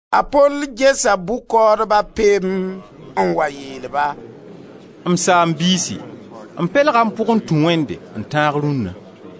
A Pol gesa bʋ-kaoodba pem n wa yeel-ba: «M saam-biisi m pelga m pʋg m tũ Wẽnde n tãag rũnna.»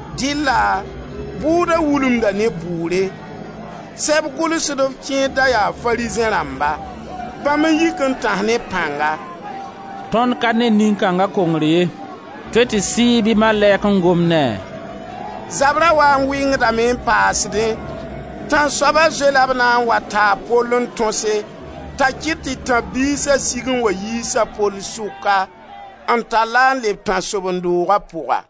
Dɩlla bʋʋda wulumda ne bʋʋre. Sɛb gʋlsdb kẽer da yaa Farizẽ rãmba. Bãmb n yik n tãs ne pãnga: «Tõnd ka ne nin-kãnga kongr ye. Tõe tɩ sɩɩg bɩ malɛk n gom ne a.» Zabra wa n wɩngdame n paasdẽ, tãnsoaba zoe-la b na n wa taa a Pol n tõse, t'a kɩt tɩ tãb-biisa sig n wa yiis a Pol sʋka, n tall-a n leb tãnsoben-dooga pʋga.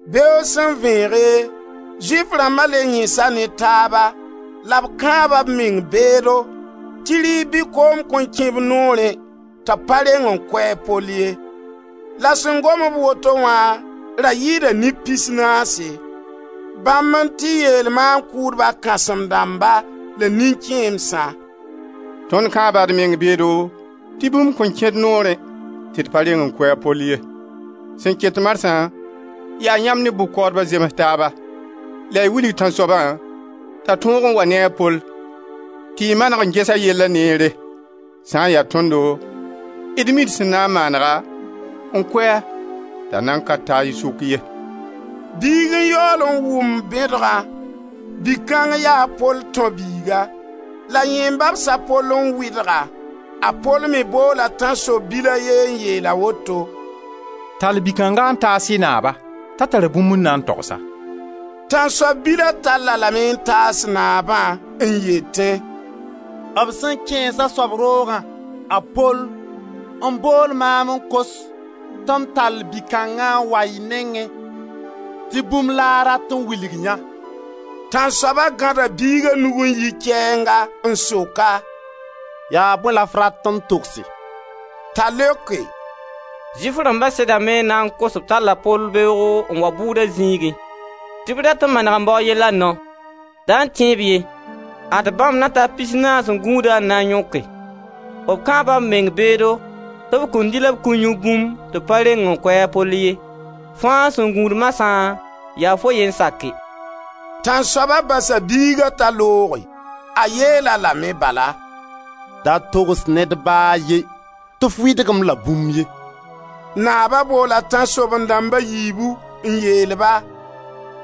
Beoog sẽn vẽege, Zʋɩf rãmba le yẽsa ne taaba la b kãaba b meng beedo tɩ rɩɩb bɩ koom kõn kẽ b noorẽ tɩ b pa reng n kʋ a Pol ye. La sẽn gom-b woto wã ra yɩɩda neb pis naase. Bãmb n tɩ yeel maan-kʋʋdba kãsem-dãmba la nin-kẽemsã: «Tõnd kãaba d meng beedo tɩ bũmb kõn kẽ d noorẽ tɩ d pa reng kʋ a Pol ye. Sẽn ket marsã yaa yãmb ne bʋ-kaoodba zems taaba la y wilg tãnsoabã t'a tog n waa ne a Pol tɩ y maneg n ges a yella neere. Sã n ya tõndo d mi d sẽn na n maanega n kʋ-a t'a nan ka ta y sʋk ye.» Biig n yaool n wʋm bẽdgã. Bi-kãng yaa a Pol tão biiga, la yẽ n babs a Pol n wɩdg-a. A Pol me boola tãnsoab bil a ye n yeel-a woto: «Tall bi kãnga n taas y naaba t'a tara bũmb n na n togs-a.» Tãnsoab bila tall-a lame n taas naabã n yetẽ: «B sẽn kẽes a soab roogã, a Pol, n bool maam n kos tɩ m tall bi-kãnga n wa y nengẽ tɩ bũmb la a rat n wilg yã.» Tãnsoaba gãda biiga nug n yi kɛɛnga n sok-a: «Yaa bõe la f rat n togse?» T'a leoke: «Zʋɩf rãmba sedame n na n kos-f tɩ b tall a Pol beoogo n wa bʋʋda zĩigẽ tɩ b rat n maneg n baoo yella nao. Da tẽ-b ye. Ad bãmb na ta pisnaase n gũusd-a n na n yõke. B kãaba b meng beedo tɩ b kõn dɩ la b kõn yũ bũmb tɩ b pa reng n kʋ a Pol ye. Fãa sẽn gũud marsã, yaa fo ye n sake.» Tãnsoaba basa biiga t'a looge; a yeel-a lame bala: «Da togs ned ba a ye tɩ f wɩdg-m la bũmb ye.» Naaba boola tãnsoaben-dãmb a yiibu n yeel-ba: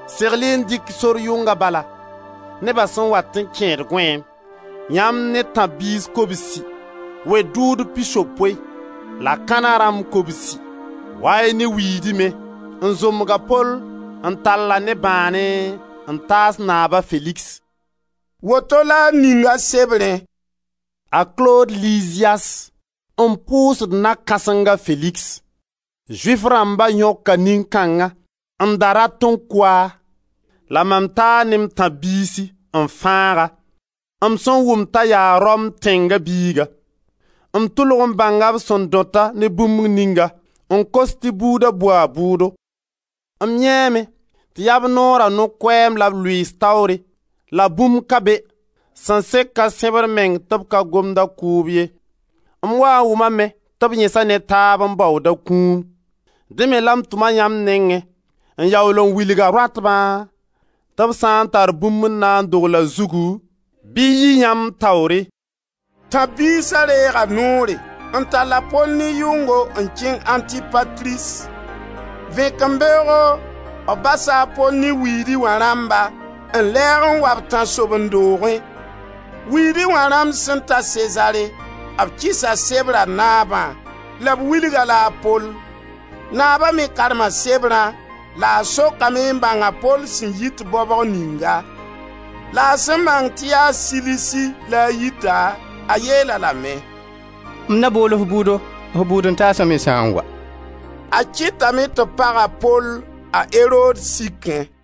«Segl-y n dɩk sor yʋnga bala, neba sẽn wat n kẽed gõeem, yãmb ne tãb-biis kobsi, wed-dʋʋdb pisopoe la kãna rãmb kobsi. Wa-y ne wiidi me, n zombg a Pol, n tall-a ne bãane n taas naab a Feligs.» Woto la a ninga sebrẽ: «A Klod Liziyas n pʋʋsd na-kãseng a Feligs! Zʋɩf rãmba yõka nin-kãnga n da rat n kʋ-a, la mam taa ne m tãb-biisi n fãag-a, m sẽn wʋm t'a yaa Rom tẽnga biiga. M tʋlg n bãnga b sẽn dõt-a ne bũmb ninga n kos tɩ buuda bʋ a bʋʋdo. M yãeeme tɩ yaa b Noora No-koɛɛm la b lʋɩɩs taoore la bũmb ka be sẽn sek a sẽbr meng tɩ b pa gomd a kʋʋb ye. M waa n wʋmame tɩ b yẽsa ne taab n baood a kũum. Dẽ me la m tʋm-a yãmb nengẽ n yaool n wilga rõatba tɩ b sã n tar bũmb n na n dogl a zugu, bɩ yɩ yãmb taoore.» Tãb-biisa reega noore n tall a Pol ne yʋngo n kẽng Antipatris. Vẽkembeoogo b basa a Pol ne wiidi wã rãmba n lɛɛg n wa b tãnsoben-doogẽ. Wiidi wã rãmb sẽn ta Sezare, b kɩsa sebra naabã la b wilg-a-la a Pol. Naaba me karma sebrã la a sokame n bãng a Pol sẽn yit baobg ninga. La a sẽn bãng tɩ yaa Silisi la a yita, a yeel-a lame: «M na bool-f bʋʋdo, f bʋʋd-n-taasa me sã n wa.» A kɩtame tɩ b pag a Pol a Erod sikẽ.